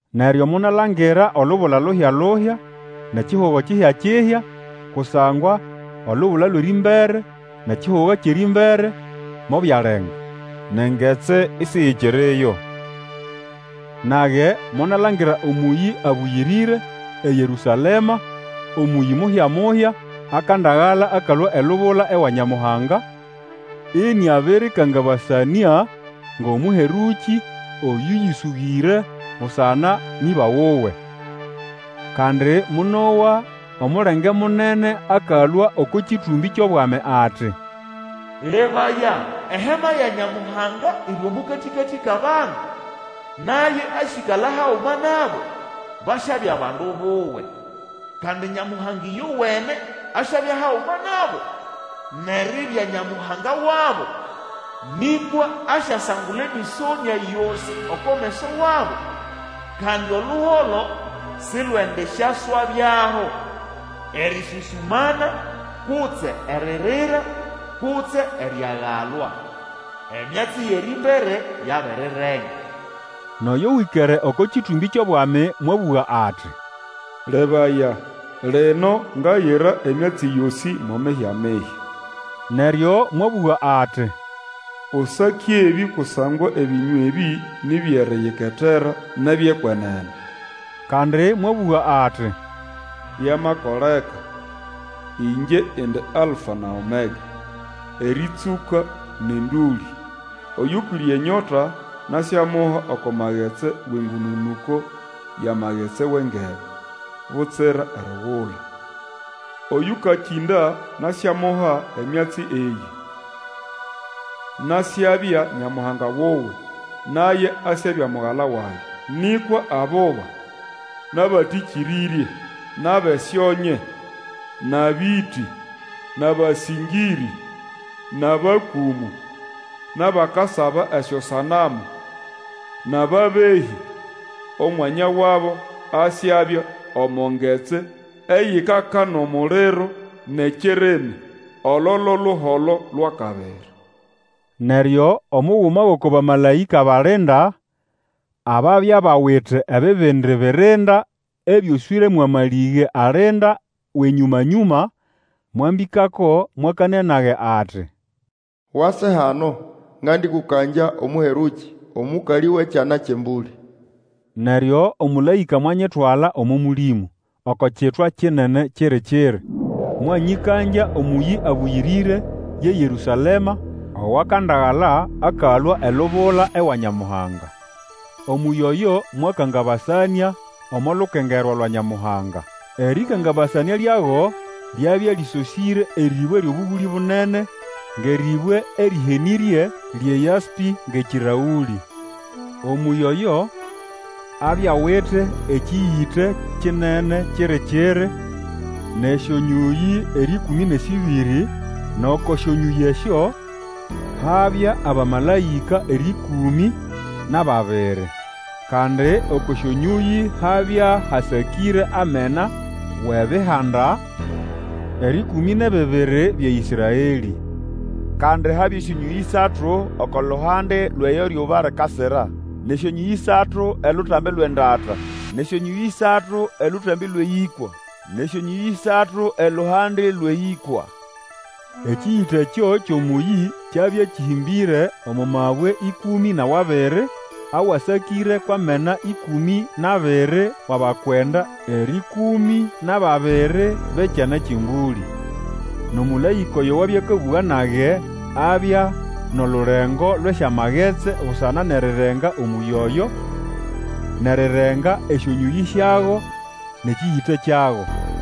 Neryo monalangira olubula luhya-luhya nʼekihugo kihya-kihya, kusangwa olubula lwʼerĩmbere nʼekihugo kyʼerĩmbere mobyalenga, nʼengetsi isiyikiriyo. Nage monalangira omũyĩ abũyĩrĩre, eYerũsalema, omũyĩ muhya-muhya, akandagala akalũa elubula ewa Nyamuhanga, ĩnĩabĩrĩyĩtegekanĩa ngʼomũherũkĩ oyũyĩsũgĩre busana nʼĩba wuwe. Kandi monowa omulenge akalũa oko kĩtũmbĩ kyʼobwami ati, Lebaya! eHema ya Nyamuhanga iri omo katĩkatĩ kʼabandu! Naye asyĩkala haguma nabo, basyabya bandu buwe. Kandi Nyamuhanga ĩyowene asyabya haguma nabo, nʼeribya Nyamuhanga wabo. Nĩkwa asyasangula emĩsonĩa yosĩ oko meso wabo. Kandi oluholo silwendisyaswabyaho, erĩsũsũmana kutse eririra, kutse eriagalwa. Emyatsi yʼerĩmbere yabirirenga. Nʼoyo wĩkere oko kĩtũmbĩ kyʼobwami mwabũga ati, Lebaya! Lino ngayira emyatsi yosĩ mo mihya-mihya. Neryo mwabũga ati, Usake ebĩ kusangwa ebĩnywa ebĩ ni byʼeriyiketera nʼebyʼekwenene. Kandi mwabũga ati, Byamakoleka! Ĩngye indi Alfa na Omega, erĩtsũka nʼendũlĩ. Oyũkwĩre enyota nasyamuha oko magetsi wʼengũnũnũko yʼamagetsi wʼengebe butsira erigula. Oyũkakĩnda nasyamuha emyatsi eyĩ: Nasyabya Nyamuhanga wuwe, naye asyabya mugala wage. Nĩkwa abuba, nʼabatĩkĩrĩrye, nʼabʼesyonye, nʼabĩtĩ, nʼabasĩngĩrĩ, nʼabakũmũ, nʼabakasaba esyosanamu, nʼababehĩ, omwanya wabo asyabya omo ngetsi eyikaka nʼomuliro nʼekirimi, olo lo luholo lwʼakabiri. Neryo omuguma wʼoko bamalaĩka balinda ababya bawite ebibindi birinda ebyoswĩre mwʼamalĩge alinda wʼenyũmanyũma mwambĩkako, mwakanĩa nage ati, Wase hano, ngandĩkũkangya Omũherũkĩ, omũkalĩ wʼEkyana kyʼEmbũlĩ. Neryo omũlaĩka mwanyitwala omo Mũlĩmũ oko kitwa kinene kiri-kiri, mwanyĩkangya omũyĩ abũyĩrĩre, ye Yerũsalema, owakandagala akalũa elubula ewa Nyamuhanga. Omũyĩ oyo mwakangabasanĩa omo lukengerwa lwa Nyamuhanga. Erĩkangabasanĩa lyago lyabya lĩsosĩre erĩbwe lyʼobũgũlĩ bunene, ngʼerĩbwe erĩhenĩrye, lyʼeYaspĩ ngʼekĩrlaũlĩ. Omũyĩ oyo abya awite ekĩyĩte kinene kiri-kiri, nʼesyonyũyĩ erĩkũmĩ nʼesĩbĩrĩ, nʼoko syonyũyĩ esyo habya abamalaĩka erĩkũmĩ nʼababiri. Kandi oko syonyũyĩ habya hasakĩre amena wʼebihanda erĩkũmĩ nʼebibiri bya Ĩsraelĩ. Kandi habya esyonyũyĩ ĩsatu oko luhande lwʼeyo ryuba likasira, nʼesyonyũyĩ ĩsatu elutambi lwʼendata, nʼesyonyũyĩ ĩsatu elutambi lwʼeyĩkwa, nʼesyonyũyĩ ĩsatu eluhande lwʼeyĩkwa. Ekĩyĩte ekyo kyʼomũyĩ kyabya kĩhĩmbĩre omo mabwe ĩkũmĩ nʼawabiri, awasakĩre kwʼamena ĩkũmĩ nʼabiri wʼabakwenda erĩkũmĩ nʼababiri bʼEkyana kyʼEmbũlĩ. Nʼomũlaĩka oyo wabya akabũga nage abya nʼolulengo lwʼesyamagetsi busana nʼerirenga omũyĩ oyo, nʼerirenga esyonyũyĩ syago, nʼekĩyĩte kyago.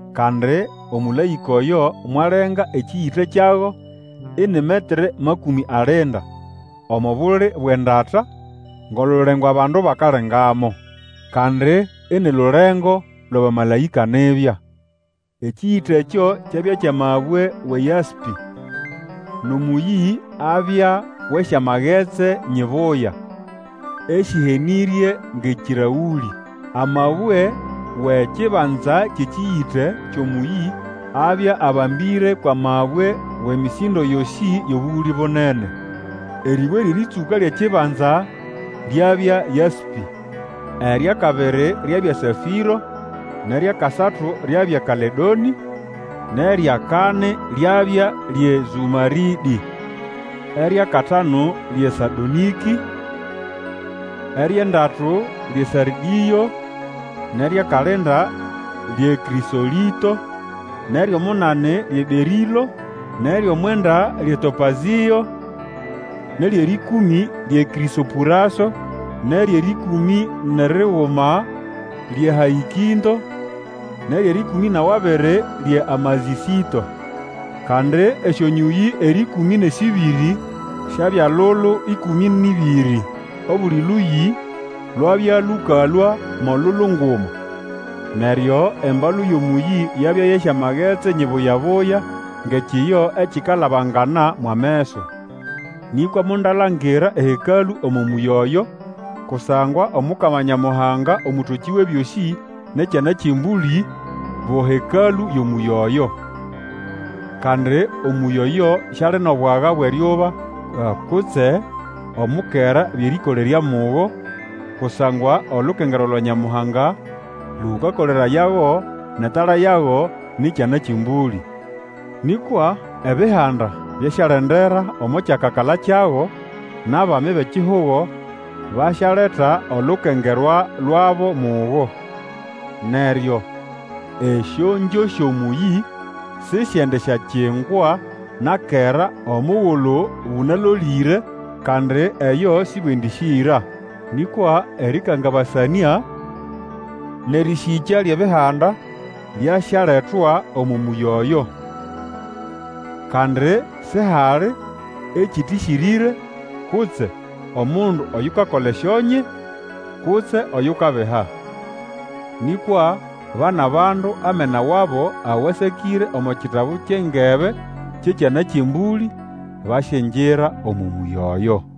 Kandi omũlaĩka oyo mwalenga ekĩyĩte kyago ini metere makũmĩ alinda omo buli bwʼendata, ngʼolulengo abandu bakalengamo, kandi ini lulengo lwʼabamalaĩka nibya. Ekĩyĩte ekyo kyabya kyʼamabwe wʼeYaspĩ, nʼomũyĩ abya wʼesyamagetsi nyibuya, esĩhenĩrye ngʼekĩraũlĩ. Amabwe wʼekibanza kyʼekĩyĩte kyʼomũyĩ abya abambĩre kwʼamabwe wʼemĩsĩndo yosĩ yʼobũgũlĩ bunene. Erĩbwe lyʼerĩtsũka lyʼekibanza lyabya Yaspĩ. Eryʼakabiri lyabya Safĩro, nʼeryʼakasatu lyabya Kaledonĩ, nʼeryʼakani lyabya lyʼeZũmarĩdĩ. Eryʼakatanu lyʼeSadonĩkĩ, eryʼendatu lyʼeSardĩo, nʼeryʼakalinda lyʼeKrĩsolĩto, nʼeryʼomunani lyʼeBerĩlo, nʼeryʼomwenda lyʼeTopazĩo, nʼeryʼerĩkũmĩ kyʼeKrĩsopũraso, nʼeryʼerĩkũmĩ nʼeriguma lyʼeHaĩkĩnto, nʼeryʼerĩkũmĩ nʼawabiri lyʼeAmazĩsĩto. Kandi esyonyũyĩ erĩkũmĩ nʼesĩbĩrĩ syabya lulu ĩkũmĩ nʼĩbĩrĩ, obuli lũyĩ lwabya lũkalũa mo lulu nguma. Neryo embalu yʼomũyĩ yabya yʼesyamagetsi nyibuya-buya, ngʼekiyo ekikalabangana mwʼameso. Nĩkwa mondalangira eHekalũ omo mũyĩ oyo, kusangwa Omukama Nyamuhanga, Omũtokĩ Wʼebyosĩ, nʼEkyana kyʼEmbũlĩ bo Hekalũ yʼomũyĩ oyo. Kandi omũyĩ oyo siali nʼobwaga bwʼeryuba kutse omukera byʼerĩkolerya mugo, kusangwa olukengerwa lwa Nyamuhanga lũkakolerayago nʼetala yago ni Kyana kyʼEmbũlĩ. Nĩkwa ebihanda, byasyalendera omo kyakakala kyago, nʼabami bʼekihugo basyaleta olukengerwa lwabo mugo. Neryo esyongyo syʼomũyĩ Sĩsyendisyakingwa na kera omugulu bũnalolĩre, kandi eyo sĩbwendĩsĩra. Nĩkwa erĩkangabasanĩa nʼerĩsĩkya lyʼebihanda byasyaletwa omo mũyĩ oyo. Kandi sihali ekĩtĩsĩrĩre, kutse omundu oyukakola esyonye, kutse oyukabiha. Nĩkwa ba nʼabandu amena wabo awasakĩre omo kitabu kyʼengebe kyʼEkyana kyʼEmbũlĩ, basyingira omo mũyĩ oyo.